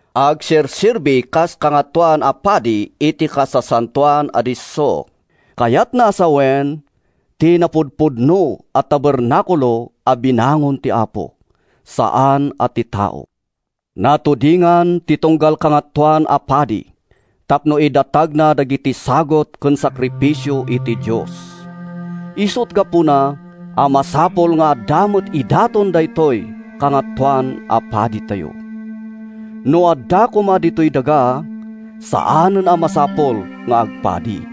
Agserserbi kas kangatoan a padi iti Kasasantoan a Disso, kayatna a sawen, ti napudpudno a tabernakulo a binangon ti Apo, saan a ti tao. Natudingan ti tunggal kangatoan a padi tapno idatagna dagiti sagut ken sakrifisio iti Dios. Isut’ gapuna a masapul nga adda met idaton daytoy Kangatoan a Paditayo. No adda koma ditoy daga, saanen a masapul nga agpadi,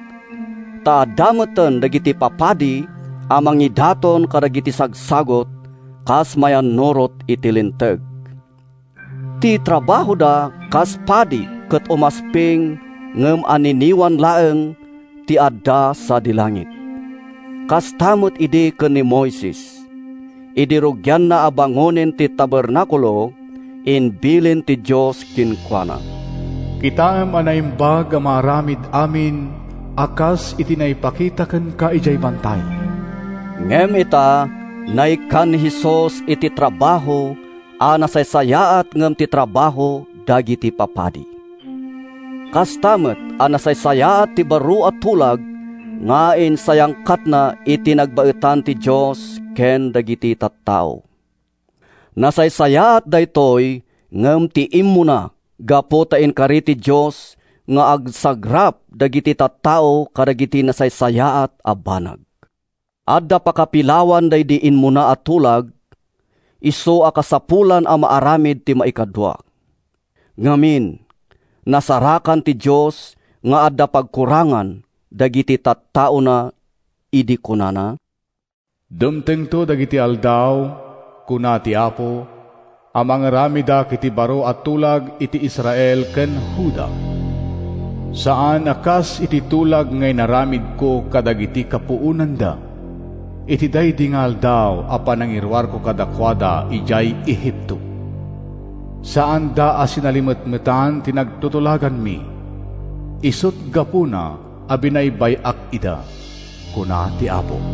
ta adda metten dagiti papadi a mangidaton kadagiti sagsagut kas mayannurot iti Linteg. Ti trabahoda kas padi ket umasping ngem anniniwan laeng ti adda sadi langit. Kasta met idi ken ni Moises. Idi rugianna a bangonen ti tabernakulo, imbilin ti Dios kenkuana, “Kitaem a naimbag a maaramid amin a kas iti naipakita kenka idiay bantay.” Ngem ita, naikkan ni Jesus iti trabaho a nasaysayaat ngem ti trabaho dagiti papadi. Kasta met a nasaysayaat ti baro a tulag nga insayangkatna iti nagbaetan ti Dios ken dagiti tattao. Nasaysayaat daytoy ngem ti immuna gapu ta inkari ti Dios nga agsagrap dagiti tattao kadagiti nasaysayaat a banag. Adda pakapilawan daydi immuna a tulag, isu a kasapulan a maaramid ti maikadua. Ngamin, nasarakan ti Dios nga adda pagkurangan dagiti tattaona idi kunana: “Dumtengto dagiti aldaw, kuna ti Apo, A mangaramidak iti baro a tulag iti Israel ken Juda. Saan a kas iti tulag nga inaramidko kadagiti kapuonanda Iti daydi aldaw a panangiruarko kadakuada idiay Egipto. Saanda a sinalimetmetan ti nagtutulaganmi, Isut’ gapuna a binaybay-ak ida, kuna ti Apo.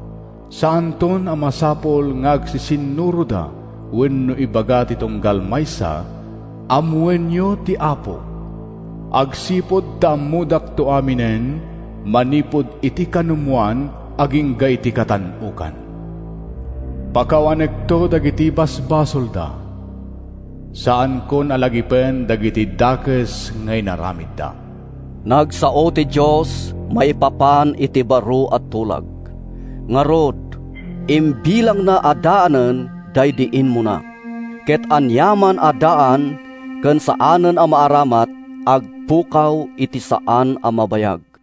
Saanton a masapul nga agsisinnuroda Wenno ibaga ti tunggal maysa, ‘Ammoenyo ti Apo.’ Agsipud ta ammodakto aminen, Manipud iti kanumoan agingga iti katan-okan. Pakawanekto dagiti basbasolda, Saankon a lagipen dagiti dakes nga inaramidda.” Nagsao ti Dios maipapan iti baro a tulag. Ngarud, imbilangna a daanen daydi immuna, ket aniaman a daan ken saanen a maaramat, agpukaw iti saan a mabayag.